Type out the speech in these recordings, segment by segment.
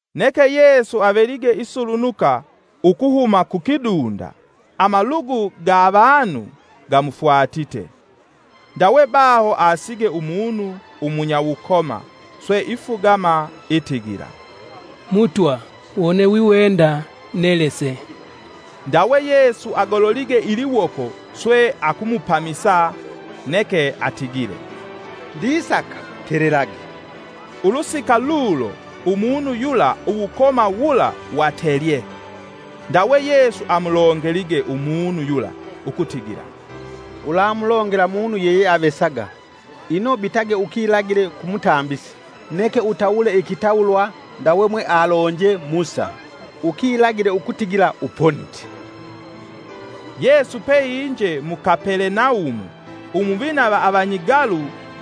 Neke Yesu avelige isulunuka ukuhuma kukidunda, amalugu ga avanu gamufwatite. Ndawe baho asige umunu umunyawukoma swe ifugama itigila, “Mutwa wone wiwenda nelese!” Ndawe Yesu agololige iliwoko swe akumupamisa, neke atigile, “Ndisaka! telelage.” Ulusika lulo umunu yula uwukoma wula watelye. Ndawe Yesu amulongelige umunu yula ukutigila, “Ulamulongela munu yeyeavesaga, ino bitage ukilagile ku mutambisi, neke utawule ikitawulwa ndawe mwealonje Musa, ukilagile ukutigila uponite.” Yesu peinje mu Kapelenaumu, umuvina va avanyigalu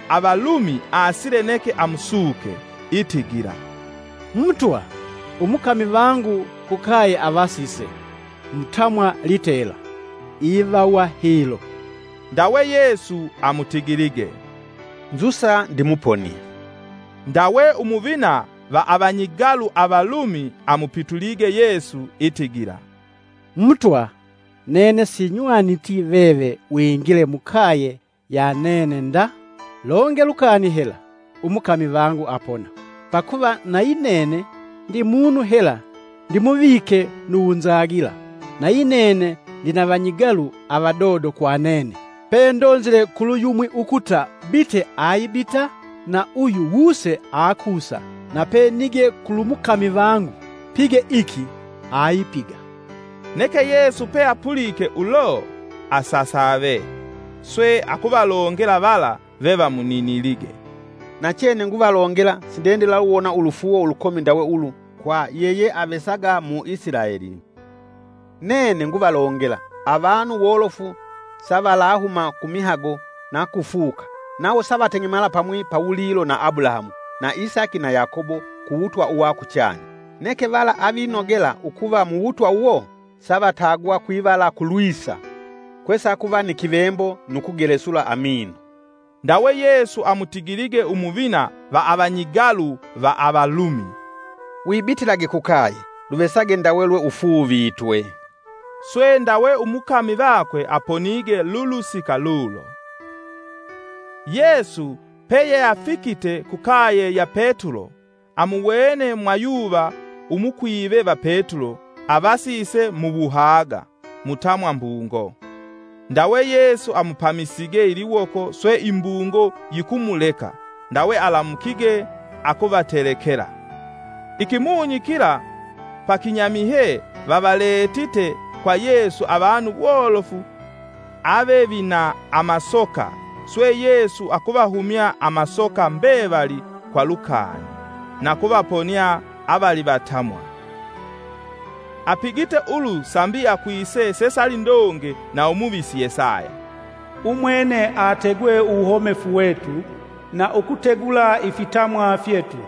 avalumi asile neke amusuke, itigila, “Mutwa, umukami vangu kukaye avasise mutamwa litela. Ivawa hilo” Ndawe Yesu amutigilige, “Nzusa ndimuponie.” Ndawe umuvina va avanyigalu avalumi amupitulige Yesu itigila, “Mutwa nene sinywaniti veve wingile mukaye ya nene nda; longe lukani hela umukami vangu apona. Pakuva nayi nene ndi munu hela ndimuvike nu wunzagila, na yinene ndina vanyigalu avadodo kwa nene, pendonzile kulu yumwi ukuta, ‘Bite!’ aibita; na uyu, ‘Wuse!’ akusa; na penige kulu mukami vangu, ‘Pige iki!’ aipiga.” Neke Yesu pe apulike ulo, asasave, swe akuvalongela vala vevamuninilige, “Nachene nguvalongela, sindendilaluwona ulufuuwo ulukomi ndawe ulu, kwa yeyeavesaga mu Isilaeli. Nene nguvalongela, avanu wolofu savalahuma kumihago na kufuka, nawo savateng'emala pamwi pawulilo na Abulahamu na Isaki na Yakobo ku wutwa uwa kuchanya. Neke vala avinogela ukuva muwutwa uwo savatagwa kwivala kulwisa, kwesakuva ni kivembo nu kugelesula amino.” Ndawe Yesu amutigilige umuvina va avanyigalu va avalumi, “Wibitilage kukaye, luvesage ndawe lweufuuvitwe.” Swe ndawe umukami vakwe aponige lulusika lulo. Yesu peyeafikite kukaye ya Petulo, amuwene mwayuva umukwive va Petulo avasise muwuhaga mutamwa mbungo. Ndawe Yesu amupamisige iliwoko swe imbungo yikumuleka, ndawe alamukige akuvatelekela. Ikimunyi kila pakinyamihye vavaletite kwa Yesu avanu wolofu avevina amasoka swe Yesu akuvahumya amasoka mbevali kwa lukani, na ukuvaponia avalivatamwa. Apigite ulu sambi akwise sesali ndonge na umuvisi Yesaya: “Umwene ategwe uwuhomefu wetu, na ukutegula ifitamwa fyetu.”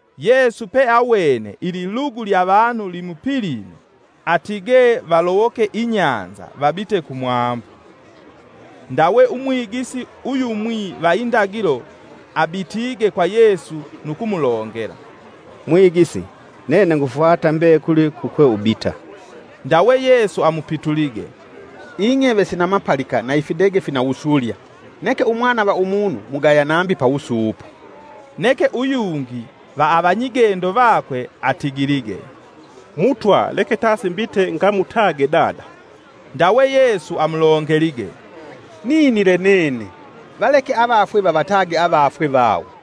Yesu peawene ililugu lya vanu limupilime, atige valowoke inyanza vabite kumwambu. Ndawe umwigisi uyumwi va indagilo abitige kwa Yesu nu kumulongela, “Mwigisi nene ngufwata mbekuli kukwe ubita.” Ndawe Yesu amupitulige, “Ing'eve sina mapalika na ifidege fina wusulya; neke Umwana va Umunu mugaya nambi pa wusuupo.” Neke uyungi va avanyigendo vakwe atigilige, “Mutwa leke tasi mbite ngamutage dada.” Ndawe Yesu amulongelige, “Ninile nene! Valeke avafwe vavatage avafwe vawo.”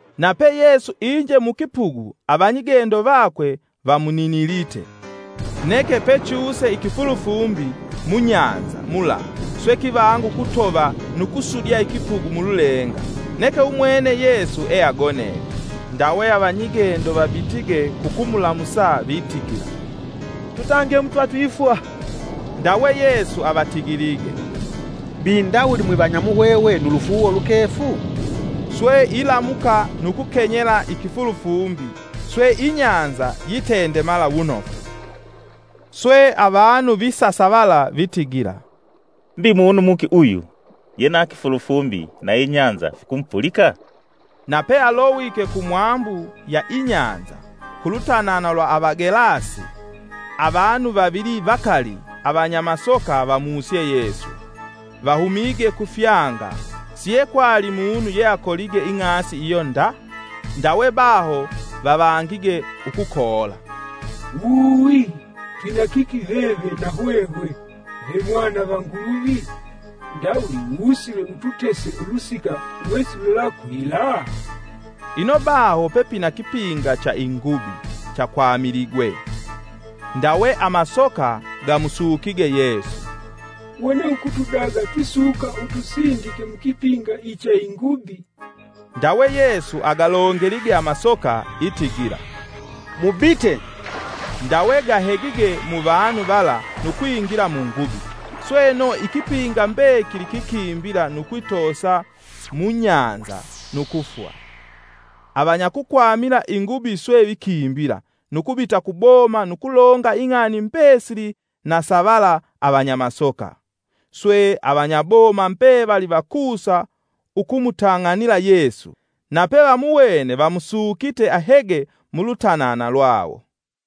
Nape Yesu inje mukipugu, avanyigendo vakwe vamuninilite. Neke pechuse ikifulufumbi munyanza mula swe kivanga ukutova nu kusudya ikipugu mululenga, neke umwene Yesu eagonelye. Ndawe avanyigendo vabitige kukumulamusa vitigila, “Tutange Mutwa twifwa!” Ndawe Yesu avatigilige, “Mbi ndawuli mwivanya muhwehwe nu lufuuwo lukefu?” Swe ilamuka nu kukenyele ikifulufumbi swe inyanza yitendemala wunofu. Swe avanu visasavala vitigila, “Mbi munu muki uyu, ye na kifulufumbi na inyanza fikumupulika?” Nape alowike kumwambu ya inyanza, kulutanana lwa Avagelasi, avanu vavili vakali avanyamasoka vamusye Yesu, vahumige kufyanga, siekwali munu ye akolige ing'asi iyo nda. Ndawe baho vavangige ukukoola, “Uuuwi! Twina kiki veve na hwehwe vemwana va Nguluvi? Ndawuli wusile ututese ulusika wesilulakwila?” Ino baho pepina kipinga cha ingubi chakwamiligwe. Ndawe amasoka, gakumusukige Yesu, “Wone ukutudaga twisuka utusindike mukipinga icha ingubi.” Ndawe Yesu agalongelige amasoka itigila, “Mubite” ndawe gahegige muvanu vala nu kwingila mungubi; sweno ikipinga mbekili kikimbila nu kwitosa mu nyanza nu kufwa. Avanyakukwamila ingubi swe vikimbila, nu kubita kuboma nu kulonga ing'ani mbesili na sa vala avanyamasoka. Swe avanyaboma mbevali vakusa ukumutang'anila Yesu; nape vamuwene vamusukite ahege mulutanana lwawo.